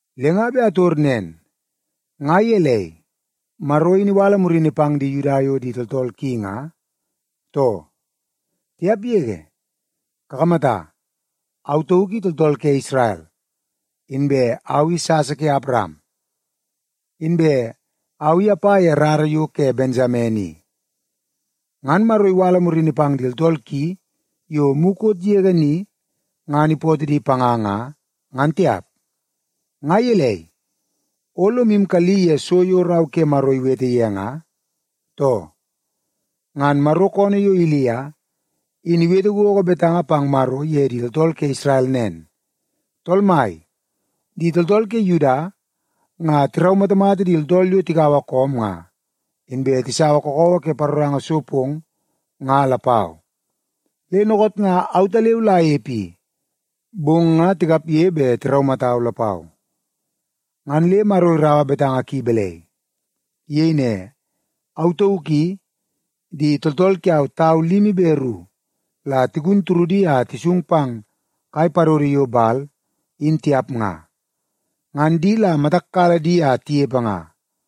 Le nga bet ator nen: Nga gelei, Maro in iwala murini pang di Yuda yo tooltool ki nga, too? Tiap yege! Kakamata, au tauk i tooltool ke Isrel, inbe au i sasa ke Awaram, inbe au i apa ye rara yo ke Bensamen i. Ngan Maro iwala murini pang di tooltool ki yo mukot yege ni ngan ipootoo di panga nga, ngan tiap. Nga gelei, o lomu kalli ye so yo Rau ke Maro iwete ye nga, too? Ngan Maro koonoo yo Ilia, in iwete gogo betanga pang Maro ye di tooltool ke Isrel nen, “Tool Mai, di tooltool ke Yuda nga tiraumatamata di tooltool yo tikaua koom nga, inbe tisaua kakawa ke paroranga so pong nga lapau. Le dookoot nga autaleu la anepe i, bong nga tikapge bet tiraumatau lapau.” Ngan le Maro iraua betanga ki balai? Iyei ne, “Au tauk i, di tooltool kiau tau limi be ru la tigun turudi a tisung pang kai padodo yo Bal i, in tiap nga. Ngan di la matak kala di a tinepe nga.”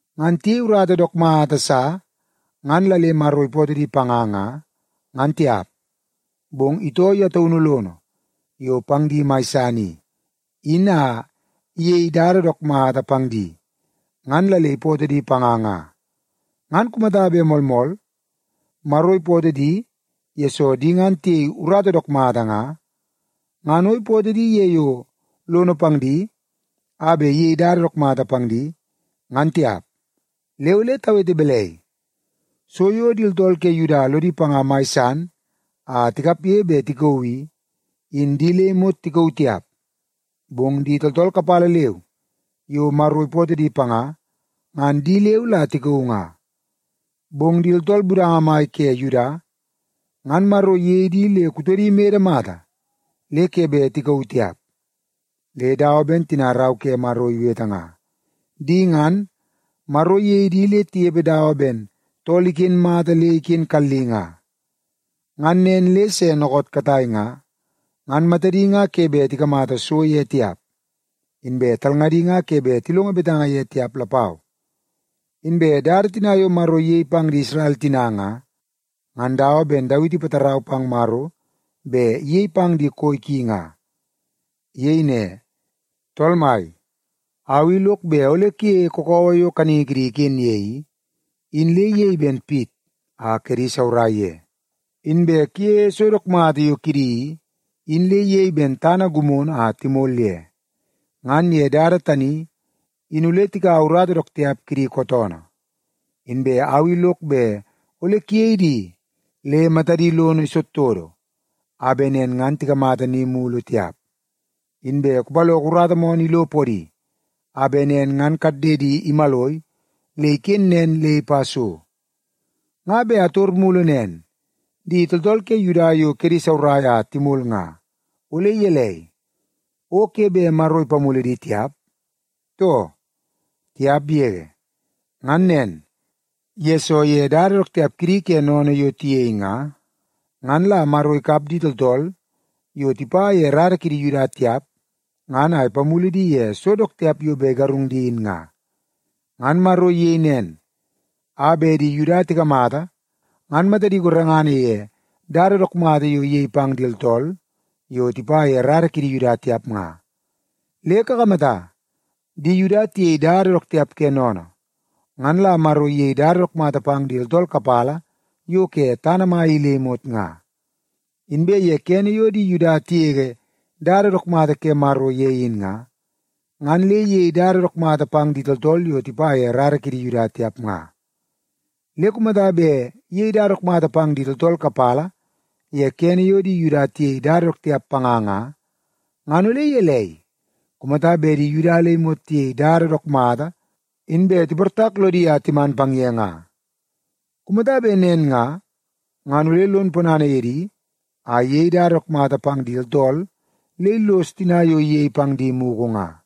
Ngan tiyei urata dook mata sa ngan la le Maro ipootoo di panga nga, ngan tiap. Bong itoo ye taunu lono yo pang di mai san i, in a iyei dada dook mata pang di, ngan la le ipootoo di panga nga. Ngan kumata bet moolmool, Maro ipootoo di yesoo di ngan tiyei urata dook mata nga, ngan o ipootoo di ye yo lono pang di a bet iyei dada mata pang di, ngan tiap. Le ole tawete balai? So yo di tooltool ke Yuda lodi panga mai san a tikapge bet tikauu i, in di le imot tikauu tiap, bong di tooltool kapala leu yo Maro ipootoo di panga, ngan di leu la tikauu nga. Bong di tooltool budanga mai ke Yuda ngan Maro iyei di le kutodi imede mata le ke bet tikauu tiap. Le dawa ben tina Rau ke Maro iwete nga, “Di ngan, Maro iyei di le tinepe dawa ben tool iken mata le iken kalli nga. Ngan nen le se dookoot katai nga, ngan matadi nga ke bet tikamata so ye tiap, inbe talngadi nga ke bet tilongo betanga ye tiap lapau.” Inbe dada tina yo Maro iyei pang di Isrel tina nga, ngan dawa ben Dawiti ipatarau pang Maro bet iyei pang di koi ki nga. Iyei ne, “Tool Mai, au i lok bet ole kuyeie kakawa yo kaningi kidi iken ye i, in le iyei ben pit a kedi saurai ye. Inbe kuyeie so dook mata yo kidi i, in le iyei ben tana gimono a timol ye. Ngan ye dada tani in ole tikaua urata dook tiap kidi kootoonoo. Inbe au i lok bet ole kuyei di le matadi lono todotodo a bet nen ngan tikamata ni mulu tiap. Inbe kupaloko urata moonoo ilo podi, a bet nen ngan kaddedi imaloi le iken nen le ipa so.” Nga bet ator mulu nen: Di tooltool ke Yuda yo kedi saurai a timol nga, ole gelei, o ke bet Maro ipamulu di tiap, too? Tiap yege! Ngan nen, yesoo ye dada dook tiap kidi ke sennene yo tiyei nga, ngan la Maro ikap di tooltool yo tipa ye rara kidi Yuda tiap ngan a ipamulu di ye so dook tiap yo bet igarung di in nga. Ngan Maro iyei nen, a bet di Yuda tikamata ngan matadi gorengana ye dada dook mata yo iyei pang di tooltool yo tipa ye rara kidi Yuda tiap nga. Le kakamata, di Yuda tiyei dada dook tiap ke sennene, ngan la Maro iyei dada dook mata pang di tooltool kapala yo ke tana mai i le imot nga. Inbe ye kene yo di Yuda tigege dada dook mata ke Maro ye in nga, ngan le iyei dada dook mata pang di tooltool yo tipa ye rara kidi Yuda tiap nga. Le kumata bet iyei dada dook mata pang di tooltool kapala ye kene yo di Yuda tiyei dada dook tiap panga nga, ngan ole gelei kumata bet di Yuda le imot tiyei dada dook mata inbe tiportak lodi a timan pang ye nga? Kumata bet nen nga, ngan ole lon ponana ye di a iyei dada dook mata pang di tooltool le illos tina yo iyei pang di mugu nga.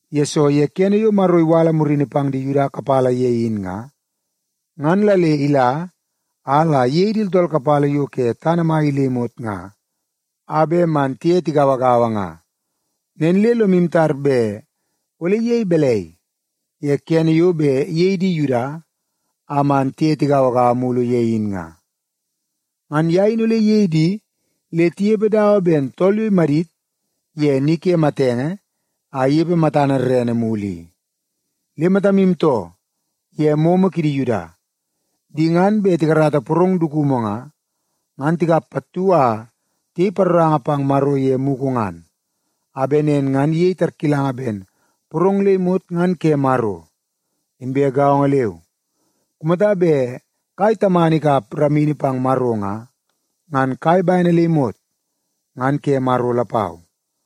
Yesoo ye kene yo Maro iwala murini pang di Yuda kapala ye in nga, ngan la le ila a la iyei di tooltool kapala yo ke tana mai i le imot nga, a bet man tiye tigauagaua nga. Nen le lomu tar bet ole iyei balai ye kene yo bet iyei di Yuda a man tiye tigauagaua mulu ye in nga? Ngan ye in ole iyei di le tinepe dawa ben tool yo imadit ye ni ke matenge a inepe matana rerene mulu i. Le matamu too ye momo kidi Yuda. Di ngan bet tikarata porong dukumu nga, ngan tikap pattu a tiyei paroranga pang Maro ye mugu ngan, a bet nen ngan iyei tarkilanga ben porong le imot ngan ke Maro. Inbe gaongo leu, kumata bet kai tamana ikap ramini pang Maro nga, ngan kai bene le imot ngan ke Maro lapau.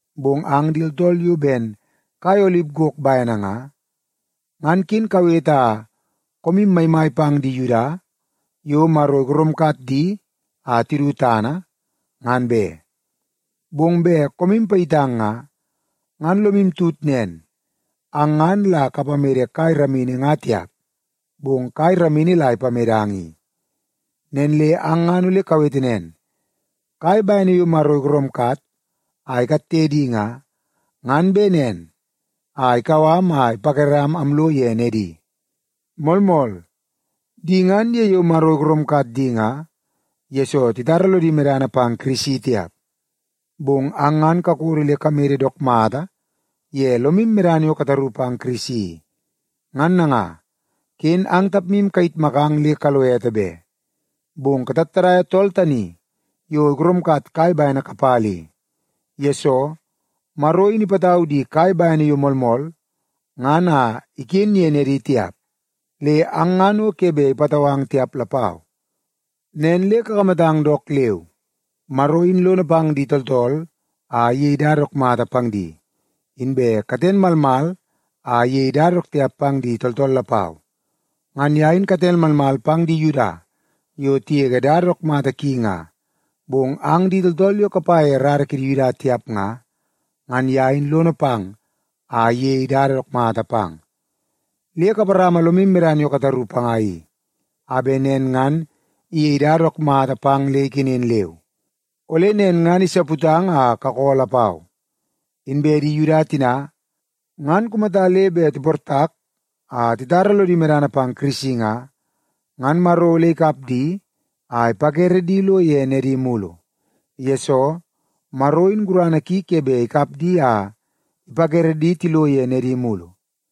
Bong ang di tooltool yo ben kai olip gok bene nga, ngan ken kawete a koomu maimai pang di Yuda yo Maro igoromkat di a tidu tana, ngan be. Bong bet koom payitang nga, ngan lomu tut nen, ang ngan la kapamede kai ramini nga tiap, bong kai ramini la ipamedang i. Nen le ang ngan ole kawete nen, “Kai bene yo Maro igoromkat a ikatte di nga, ngan bet nen a ikau am a ipakeram amlo ye nedi.” Moolmool, di ngan ye yo Maro igoromkat di nga, yesoo titara lodi medana pang Kirisi tiap. Bong ang ngan kakodo le kamede dook mata ye lomu medana yo kataru pang Kirisi i. Ngan nanga, ken ang tapmu kayitmakang le kalo ete be, bong katattadaia tool tani yo igoromkat kai bene kapala i. Yesoo, Maro in ipatau di kai bene yo moolmool ngan a iken ye nedi tiap, le ang ngan o ke bet ipatau ang tiap lapau. Nen le kakamatang dook leu! Maro in lono pang di tooltool a iyei dada dook mata pang di, inbe katen malmal a iyei dada dook tiap pang di tooltool lapau. Ngan ye in katen malmal pang di Yuda yo tigege dada dook mata ki nga, bong ang di tooltool yo kapa ye rara kidi Yuda tiap nga, ngan ye in lono pang a iyei dada dook mata pang. Le kaparama lomu medana yo kataru panga i, a bet nen ngan iyei dada dook mata pang le ikenen leu. Ole nen ngan isaputang a kakoo lapau. Inbe di Yuda tina, ngan kumata le bet tiportak a titara lodi medana pang Kirisi nga, ngan Maro ole ikap di a ipakere di lo ye nedi mulu. Yesoo, Maro in gurana ki ke bet ikap di a ipakere di tilo ye nedi mulu.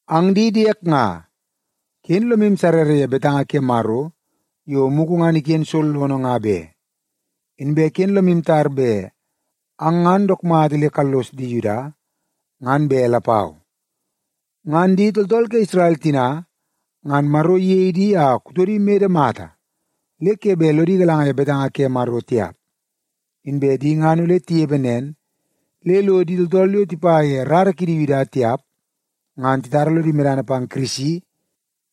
Ang di diek nga, ken lomu sarrara ye betanga ke Maro yo mugu ngan iken sollono nga be, inbe ken lomu tar bet ang ngan dook mata le kallos di Yuda, ngan be lapau. Ngan di tooltool ke Isrel tina ngan Maro iyei di a kutodi mede mata le ke bet lodi galanga ye betanga ke Maro tiap. Inbe di ngan ole tinepe nen le lo di tooltool yo tipa ye rara kidi Yuda tiap ngan titara lodi medana pang Kirisi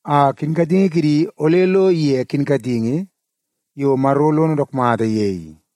a kinkatingi kidi ole lo ige kinkatingi yo Maro lono dook mata ye i.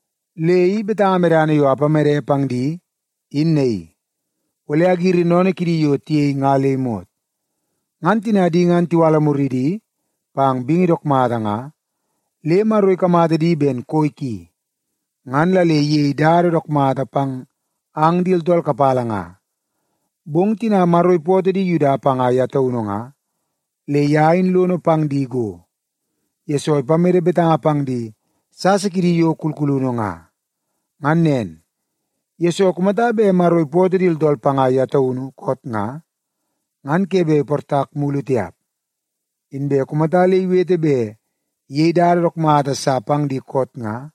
Le i betanga medana yo apamede pang di, in naii: Ole agiri sennene kidi yo tiyei nga le imot.” Ngan tina di ngan tiwala muridi pang bingi dook mata nga, le Maro ikamata di ben koi ki, ngan la le iyei dada dook mata pang ang di tooltool kapala nga. Bong tina Maro ipootoo di Yuda panga ye taunu nga, le ye in lono pang di go, yesoo ipamede betanga pang di sasa kidi yo kulkulunu nga. Ngan nen, yesoo kumata bet Maro ipootoo di tooltool panga ye taunu koot nga, ngan ke bet iportak mulu tiap. Inbe kumata le iwete bet iyei dada dook mata sa pang di koot nga,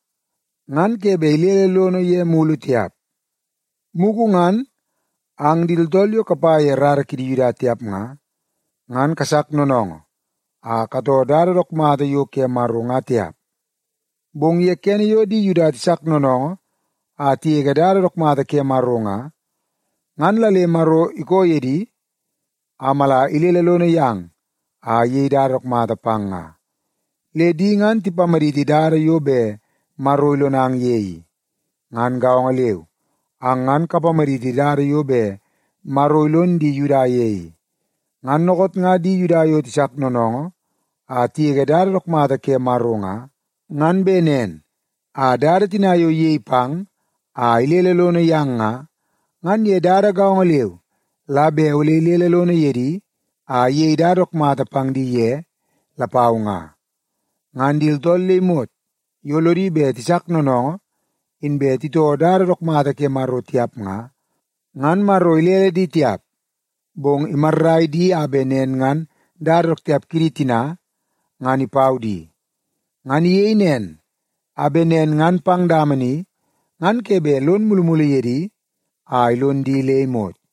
ngan ke bet ilele lono ye mulu tiap. Mugu ngan, ang di tooltool yo kapa ye rara kidi Yuda tiap nga, ngan kasak noonoongoo a katoo dada dook mata yo ke Maro nga tiap. Bong ye kene yo di Yuda tisak noonoongoo a tigege dada dook mata ke Maro nga, ngan la le Maro ikoo ye di a mala ilele lono yang a iyei dada dook mata pang nga. Le di ngan tipamaditi dada yo bet Maro ilonang ye i. Ngan gaongo leu, ang ngan kapamaditi dada yo bet Maro ilon di Yuda ye i. Ngan dookoot nga di Yuda yo tisak noonoongoo a tigege dada dook mata ke Maro nga, ngan bet nen a dada tina yo iyei pang a ilele lono yang nga, ngan ye dada gaongo leu la bet ole ilele lono ye di a iyei dada dook mata pang di ye lapau nga. Ngan di tooltool le imot yo lodi bet tisak noonoongoo inbe titoo dada dook mata ke Maro tiap nga, ngan Maro ilele di tiap, bong imarrai di a bet nen ngan dada dook tiap kidi tina, ngan ipau di. Ngan iyei nen, a bet nen ngan pang dama ni ngan ke bet lon mulumulu ye di a ilon di le imot.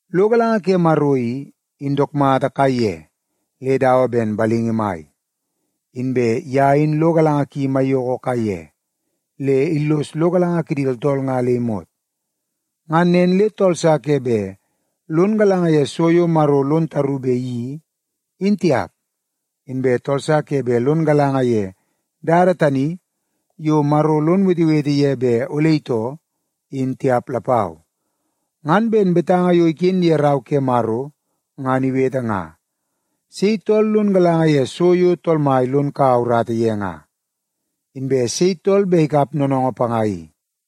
Lo galanga ke Maro i, in dook mata kaiye le dawa ben balingi mai! Inbe ye in lo galanga ki maiyoko kaiye, le illos lo galanga kidi tooltool nga le imot. Ngan nen le tool sa ke bet lon galanga ye so yo Maro lon taru bet iyeii, in tiap. Inbe tool sa ke bet lon galanga ye dada tani yo Maro lon wetewete ye bet ole itoo, in tiap lapau. Ngan ben betanga yo iken ye Rau ke Maro ngan iwete nga, “Sei tool lon galanga ye so yo Tool Mai lon kaua urata ye nga? Inbe sei tool bet ikap noonoongoo panga i?”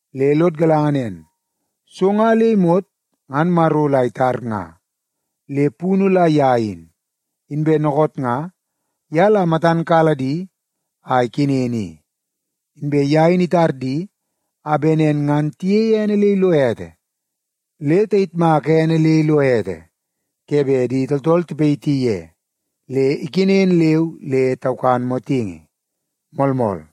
Le lod galanga nen, so nga le imot ngan Maro la itar nga, le punu la ye in. Inbe dookoot nga, ye la matan kala di a ikenen i. Inbe ye in itar di a bet nen ngan tiyeie ene le ilo ete. Le tayitmaka ene le ilo ete ke bet di tooltool tipayiti ye le ikenen leu le taukan motingi. Moolmool.